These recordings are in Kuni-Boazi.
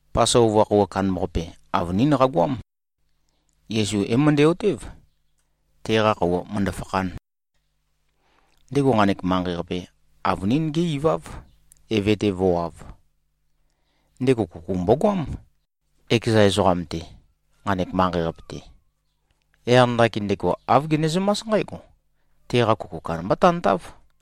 Pasova khøuwa kandambaqape, avønín qagoám. Yesu é-møndæ-otév, teqa khøuwa mø̀ndø-fakhān. Ndego nqanek manqei-qape, avønín gé-iváv, Eve-te vǿwāv. Ndego kuku mbogoám, ekeza ezoqam-te, nqanek manqei-qape-te. Yaq ndakin ndego āv genezømás nqǽgo: Teqa kuku kandamba tantáv.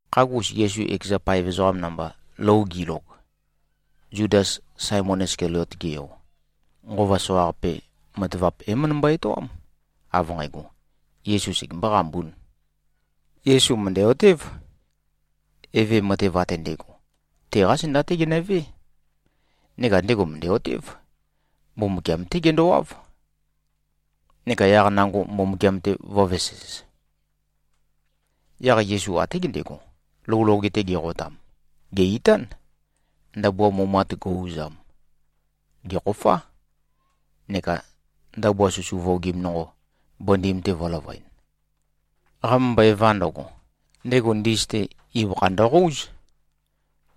Khagus, Yesu ekeza paev ezoqam namba, lou gilog, Zudas, Saemon Iskaliot-ge yo, nqova soqaqape matavap é-møndømbo-etoám, av nqægo, Yesu segembō-qambūn. Yesu mø̀ndæ-otév, Eve matev ate ndægo, teqá zenda-té genøvé. Neka ndego mø̀ndæ-otév, Mbumbukiam-té gendowáv, neka yaq nango Mbumbukiam-te vǿvesēz. Yaq Yesu até gendego, lou loge-te geqotam, gè-itán, ndabua mumat go꞉-uzam, gèkhofá, neka ndabua susu vuogim nonqo, bøndim-te vø̄løvøen. Qamømbøeva ndøgo, ndego ndis-te ibøkha ndøqóuz,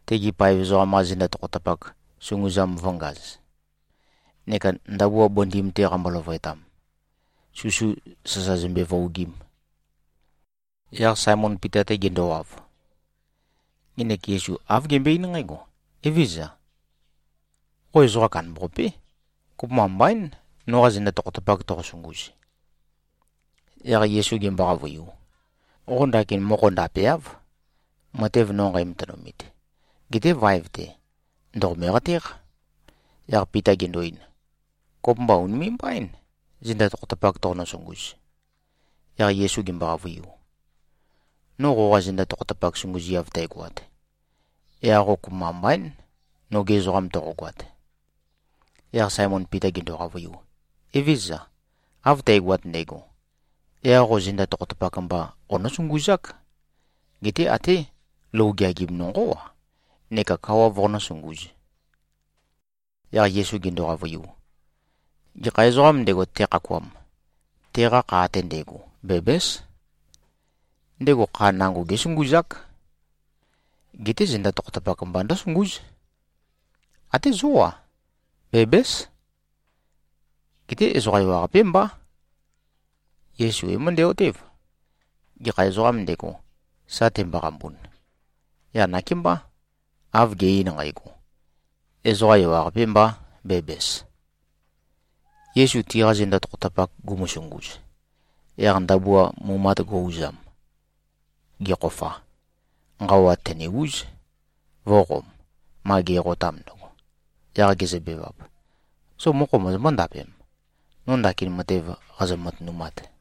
tegi paev ezoqam-qa zenda tokhotapak sunguzam vø̄ngaz, neka ndabua bøndim-te qambo-løvøetam, susu sasa zømbe-vuogim. Yaq Saemon Pita-te gendowav, ngenek Yesu āv gembøe-eín nqǽgo, “Evézøza. Qo ezoqa kandambaqapé. Kopømba mbaín, noqa zenda tokhotapak toqosunguz.” Yaq Yesu gembo-qavøiu, “Qo ndakin mokho ndapeáv, matev no nqæmatønumit. Geté vaev-te ndòqome-qatéq.” Yaq Pita gendo-ein, “Kopømba ùnime꞉-mbaín, zenda tokhotapak toqonø-sunguz.” Yaq Yesu gembo-qavøiu, “No qoqa zenda tokhotapak sunguziav tøgoat, yaq qo kopømba mbaín, noge ezoqam toqogoat.” Yaq Saemon Pita gendo-qavøiu, “Evézøza! Av tægoat ndægo, yaq qo zenda tokhotapak mba qonǿ-sunguzák, geté até lou geagim nonqó-a neka kawa voqonǿ-sungūz.” Yaq Yesu gendo-qavøiu, “Gekha ezoqām ndego, tekhakuam, teqa kha ate ndægo bæbǽs. Ndego kha nango gésunguzák. Geté zenda tokhotapak mba ndǿsungúz. Até zó-a, bæbǽs. Geté ezoqa ewaqapé mbá.” Yesu é-møndæ-otév, gekha ezoqām ndego, sa temboqambun. Yaq nakémbá, av ge꞉-ein nqægo, “Ezoqa ewaqapē mbā, bæbæs.” Yesu tiqa zenda tokhotapak gumusunguz, yaq ndabua mumat go꞉-uzam, gekhofa, nqawa tène-úz, vø̄qom, ma geqotam ndøgo. Yaq gezøbevap, “Zo mokho mozombó-ndapem, no ndakin matev qazø-matønumat?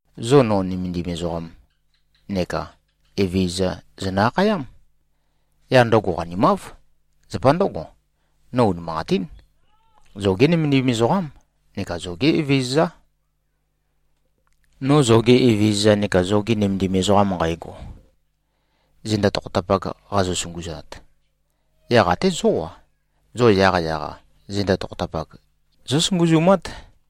Zo no ‘Nømendim ezoqam’ neka ‘Evezøza’ zonø-akhayám. Yaq ndøgo qanimáv. Zapa ndǿgo, no unimanqatín, zoge nømendim ezoqám neka zoge Evezøzá. No zoge Evezøza neka zoge nømendim ezoqam nqægo, zenda tokhotapak qazø-sunguzat, yaq até zó-a, zo yaqyaq-a zenda tokhotapak zósunguzumát.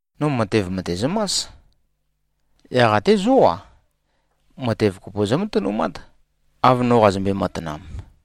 No matev mø̀tezømás. Yaq até zó-a, matev kopo zómatønumát, av no qazømbe-matanam.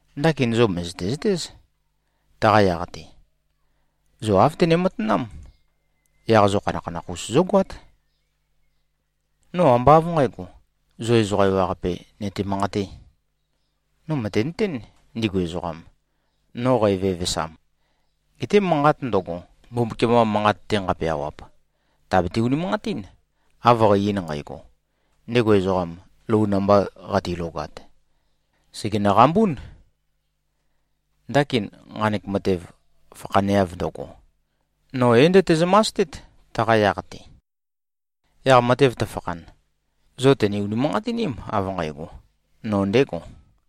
Ndakin zo mø̀zøte-zøtéz, taqa yaq-te. Zo āv tøne-matanám. Yaq zo khanakhanakh-us zógoát. No ambá av nqǣgo, zo ezoqa ewaqape nøte-manqatē. No mø̀tenøtén, ndigu ezoqam, no qævevesam. Geté manqat ndøgo, Mbumbukiam-qa manqat-te nqapeawap, tàbete-unimanqatín, av qæ-ein nqægo, ‘Ndego ezoqam, lou namba qatilogat, sègenø-qambún.’ Ndakin, nqanek matev fakhaneav ndøgo, no é-ndøtezømastét, taqa yaq-te. Yaq matev tøfakhan, zo tø̀ne-unimanqatiním, av nqægo, no ndégo.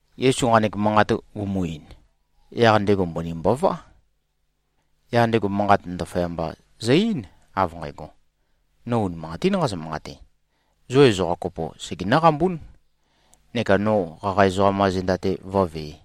Yesu nqanek manqat gumu-ein, yaq ndego mbøni mbová. Yaq ndego manqat ndaføyamba zø-eín, av nqægo, “No unimanqatín nqazø-manqate, zo ezoqa kopo segenǿ-qambún, neka no qaqa ezoqam-qa zenda-te vǿvē.”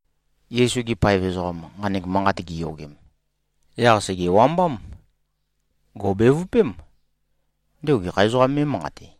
Yesu-gi paev ezoqam, nqanek manqat giyogem, yaq sègewambám. Gò꞉bevøpém, ndego gekha ezoqām mé꞉manqate.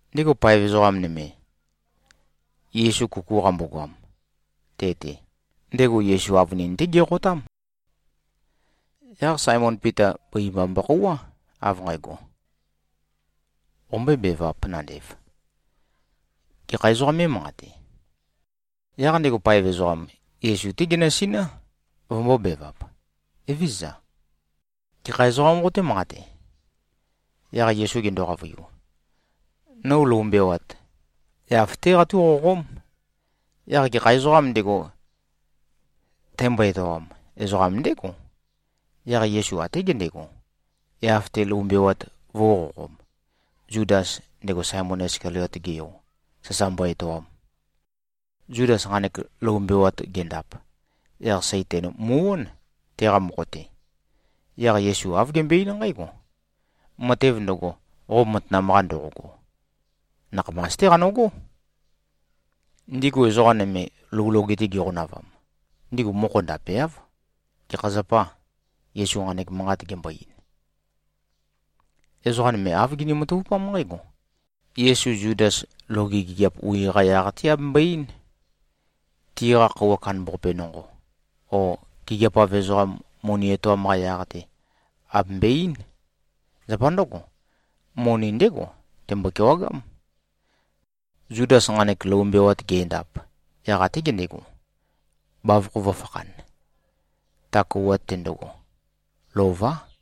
Ndego paev ezoqa nøme, Yesu kuku qambogoam te-te, ndego Yesu avønin-té geqotám. Yaq Saemon Pita, bøi mba mbokhouwá, av nqægo, “Qombøébevāp, nandev. Gekha ezoqā mé꞉manqate?” Yaq ndego paev ezoqam, Yesu-té genøsiná, vømbōbevap, “Evézøza. Gekha ezoqām qoté-manqate?” Yaq Yesu gendo-qavøiu, “No lou mbewat, yaf-té qatúqoqóm. Yaq gekha ezoqām ndego, tæmbo-etoam, ezoqam ndégo.” Yaq Yesu até gendego, yaf-te lou mbewat vø̄uqoqom, Zudas, ndego Saemon Iskaliot-ge yo, sasa mbo-etoam. Zudas nqanek lou mbewat gendap, yaq Saitan mu꞉-ón, teqa mokho-te. Yaq Yesu āv gembøe-eín nqǽgo, “Matev ndøgo, qo matanam-qa ndoqogo, nakhamas-té qanøgó.” Ndigu ezoqa nøme, lou loge-te giqonavam, ndigu mokho ndapeáv, gekha zapā Yesu nqanek manqat gembo-ein. Ezoqa nøme āv gini-matavupám nqǽgo: Yesu Zudas loge gigiap wi-qa yaq-te abembøe-eín, tiqa khøuwa kandambaqape nonqo, o gigiap-av ezoqam moni etoam-qa yaq-te abembøe-eín. Zapa ndǿgo, moni ndégo tembo-kewagám. Zudas nqanek lou mbewat ge꞉ndap, yaq até gendego, bavokho vø̄fakhan. Ta khøuwa-te ndøgo, lová.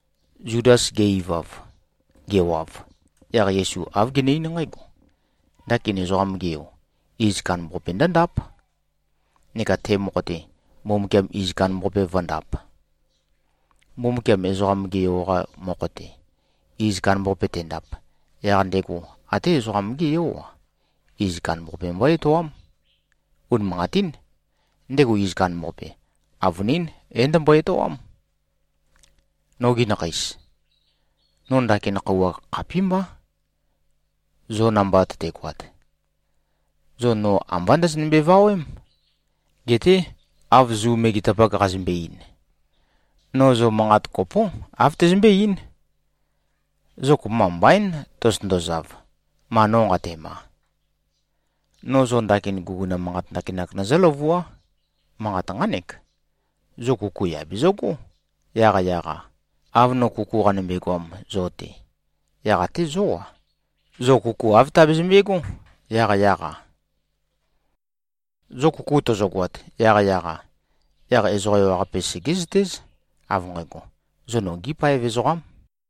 Zudas ge-ivav, gewav, yaq Yesu āv gene-eín nqǽgo, “Ndakin Ezoqam-ge Yo, iz kandambaqape ndǿndáp. Neka te mokho-te, Mbumbukiam iz kandambaqape vǿndāp. Mbumbukiam Ezoqam-ge Yo-qa mokho-te, iz kandambaqape tendap, yaq ndego até Ezoqam-gé Yó-a, iz kandambaqape mbó-etoám. Unimanqatín, ndego iz kandambaqape, avønín é-ndømbo-etoám. Nogi nakheis. No ndakin khøuwa khapímbá, zo namba tøtegoat. Zo no ambá ndøzønømbe-vawém. Geté, av Zu megetapak qazømbe-ein, no zo manqat kopó, āv tæzømbé-eín, ‘Zo kopømba mbaín tozotøndozav, ma no nqatema.’ No zo ndakin guguna manqat ndakinak nøzǿ-løvuá. Manqat nqánek: Zo kuku yà bezøgó, yaqyaq-a. Av no kuku qanømbe-goam zo-te, yaq até zó-a, zo kuku āv tabezømbe꞉gó, yaqyaq-a. Zo kuku tøzøgoat, yaqyaq-a, yaq ezoqa ewaqape segézøtéz, av nqægo, zo nogí paev ezoqám.”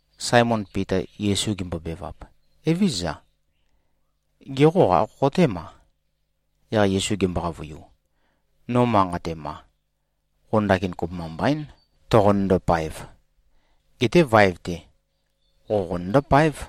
Saemon Pita Yesu gembobevap, “Evézøza. Gê, qo ākhoqotéma?” Yaq Yesu gembo-qavøiu, “No ma nqatema, qo ndakin kopømba mbaín, toqonøndo-paev. Geté vaev-te, qo qonøndó-páev.”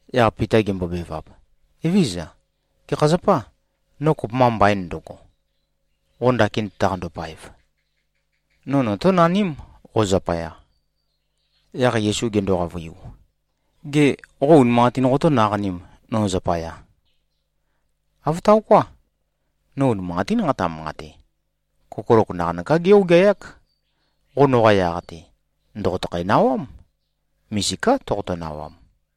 Yaq Pita gembobevap, “Evézøza, gekha zapâ, no kopømba mbaīn ndøgo, qo ndakin tøtaqando-paev? No notónaním, qo zapaya.” Yaq Yesu gendo-qavøiu, “Gê, qo unimanqatīn qotó-naqanīm no zapaya? Āv taoká. No unimanqatín nqataqa-manqate, kokolok naqanøká gé-ogeayák. Qo noqa yaq-te, ndòqotøkhæ-nawám. Misiká toqoto-nawam.”